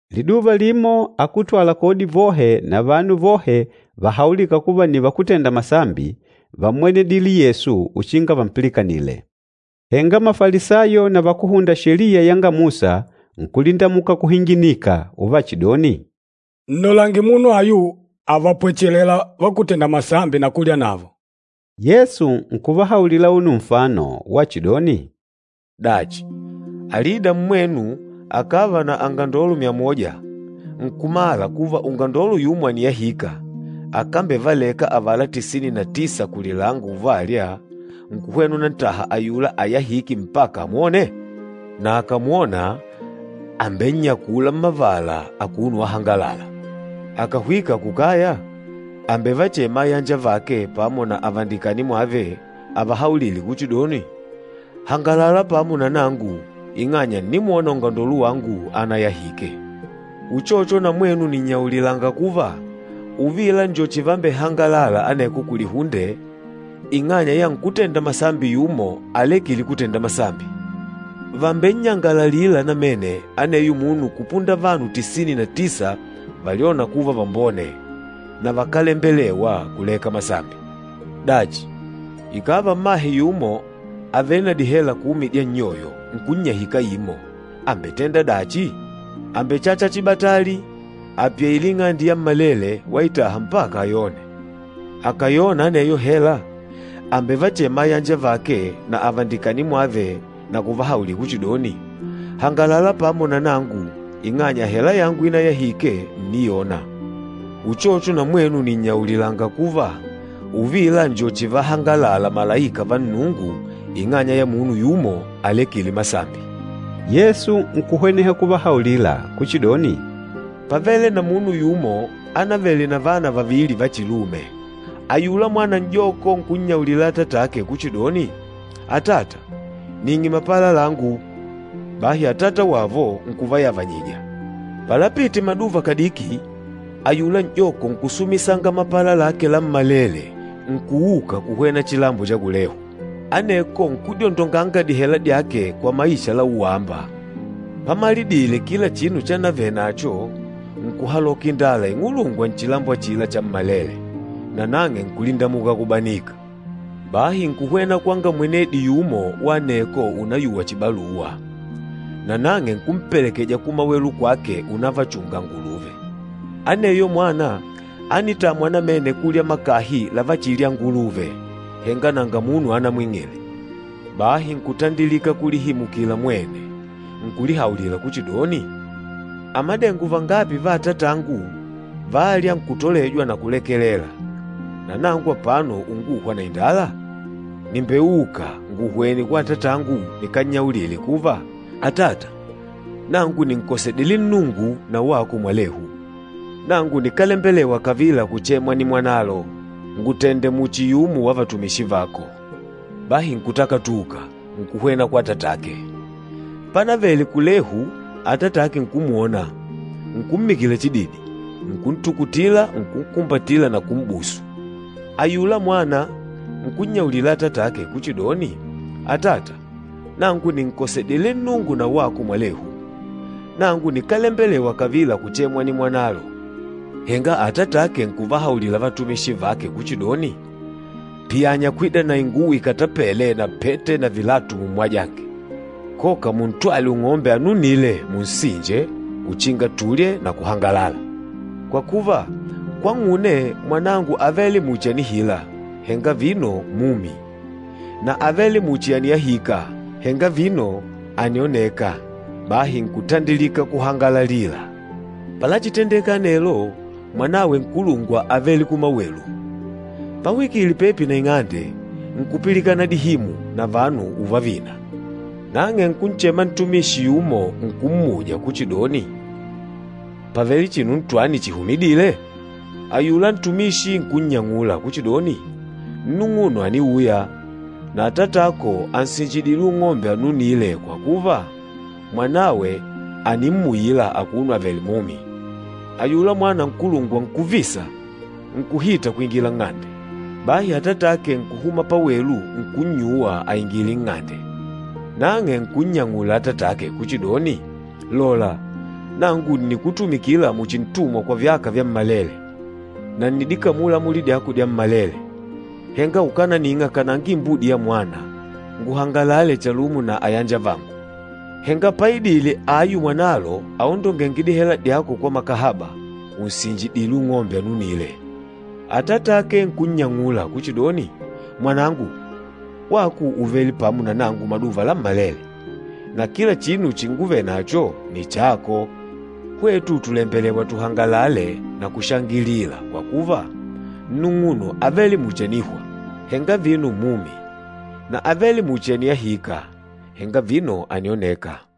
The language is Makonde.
Liduva limo akútwala kodi vohe na vanu vohe vahaulîka kuva nni vakútenda masambi, vámmwenedile Yesu uchinga vampilikanile. Henga Mafalisayo na vakúhunda Sheliya yanga Musa nkulindamuka kuhinginika uvachidoni, “Nnolange munu ayu àvapwechelela vakútenda masambi na kulya navo!” Yesu nkuvahaulila auno nfano wachidoni, “Dachi, alida mmwenu akàva na angandolo myamoja, nkumala kuva ungandolo yumo àniyahika, akambevaleka avala tisini na tisa kulilanga uvalya, nkuhwena unantaha ayula ayahîke mpaka amwone? Na akàmwona àmbennyakula mmavala, akuno wahangalala. Akàhwika kukaya, àmbevachema ayanjavake pamo na avandikani mwave, avahaulile kuchidoni, ‘Hangalala pamo na nangu, ing'anya ǹnimwona ungandolo wangu anayahike.’ Uchocho, na mwenu nìnnyaulilanga kuva, uvila njo chivambehangalala aneko kulihunde ing'anya ya nkútenda masambi yumo alekîle kutenda masambi. Vàmbennyangalalila namene aneyo munu kupunda vanu tisini na tisa valyôna kuva vambone, na vakálembelewa kuleka masambi.” “Dachi, ikàva mmahe yumo àvele na dihela kumi dya nnyoyo, nkunnyahika imo, àmbetenda dachi? Àmbechacha chibatali, apyaile ing'ande yammalele waitaha mpaka ayone. Akàyona aneyo hela, àmbevachema ayanjavake na avandikani mwave na kuvahaulila kuchidoni, ‘Hangalala pamo na nangu ing'anya hela yangu inayahike ǹniyona!’ Uchocho na mwenu nìnnyaulilanga kuva, uvila njo chivahangalala malaika va Nnungu ing'anya ya munu yumo alekîle masambi.” Yesu nkuhweneha kuvahaulila kuchidoni, “Pávele na munu yumo ánavele na vana vavili vachilume. Ayula mwana n'joko nkunnyaulila atatake kuchidoni, ‘Atata, ning'e mapala langu.’ Bahi atata wavo nkuvayavanyija. Palapite maduva kadiki, ayula n'joko nkusumisanga mapala lake lammalele nkuuka kuhwena chilambo cha kulehu, aneko nkudyondonga dihela dyake kwa maisha la uwaamba. Pamalidile kila chinu chanavenacho, nkuhaloka indala ing'ulungwa nchilambo achila chammalele, nanang'e nkulindamuka kubanika. Bahi nkuhwena kwanga mwenedi yumo wa aneko unayuwa chibaluwa, nanang'e nkumpelekeja kumawelu kwake unavachunga anguluve. Aneyo mwana ánitamwa namene kulya makahi lavachilya anguluve, henga nanga munu anamwing'ile. Bahi nkutandilika kulihimukila mwene, nkulihaulila kuchidoni, ‘Amadengo vangapi va atatangu vâlya, nkutolejwa na kulekelela, na nangu apano unguhwa na indala? Nìmbeuka, nguhwene kwa atatangu nikannyaulile kuva, atata, nangu nìnkosedile Nnungu na wako mwalehu. Nangu nikálembelewa kavila kuchemwa nimwanalo. Ngùtende muchi yumo wa vatumishi vako.’ Bahi nkutakatuka, nkuhwena kwa atatake. Pánavele kulehu, atatake nkumwona, nkummikila chididi, nkuntukutila nkunkumbatila na kum'busu. Ayula mwana nkunnyaulila atatake kuchidoni, ‘Atata, nangu nìnkosedile Nnungu na wako mwalehu. Nangu nikálembelewa kavila kuchemwa nimwanalo.’ Henga atatake nkuvahaulila vatumishi vake kuchidoni, ‘Piyanya kwida na inguwo ikatapêle na pete na vilatu mummwajange! Koka muntwale ung'ombe anunîle munsinje, uchinga tulye na kuhangalala! Kwa kuva, kwang'une mwanangu ávele muchi ànihila, henga vino mumi, na ávele muchi àniyahika, henga vino ànioneka.’ Bahi nkutandilika kuhangalalila. Palachitendeka anelo, mwanawe nkulungwa ávele kumawelu. Pahwikile pepi na ing'ande, nkupilikana dihimu na vanu uvavina. Nang'e nkunchema ntumishi yumo nkummuja kuchidoni, ‘Pàvele chinu chihumidîle?’ Ayula ntumishi nkunnyang'ula kuchidoni, ‘Nnung'uno àniuya, na atatako ànsinjidile ung'ombe anunîle kwa kuva, mwanawe ànimmuila akuno avèlè mumi.’ Ayula mwana nkulungwa nkuvisa, nkuhita kwingila nng'ande. Bahi atatake nkuhuma pawelu nkunnyuwa aingile nng'ande. Nang'e nkunnyang'ula atatake kuchidoni, ‘Lola, nangu ǹnikutumikila muchi ntumwa kwa vyaka vyammalele, na ǹnidikamula amuli dyako dyammalele. Henga ukánaning'a kananga imbudi yamwana nguhangalale chalumo na ayanjavangu! Henga páidìlè ayu mwanalo aondongênge dihela dyako kwa makahaba, ùnsinjidile ung'ombe anunîle.’ Atatake nkunnyang'ula kuchidoni, ‘Mwanangu, wako ùvele pamo na nangu maduva lammalele, na kila chinu chinguvele nacho, nni chako. Hwetu tùlembelewa tuhangalale na kushangilila kwa kuva, nnung'uno ávele muchi ànihwa, henga vino mumi na ávele muchi àniyahika, henga vino ànioneka.’”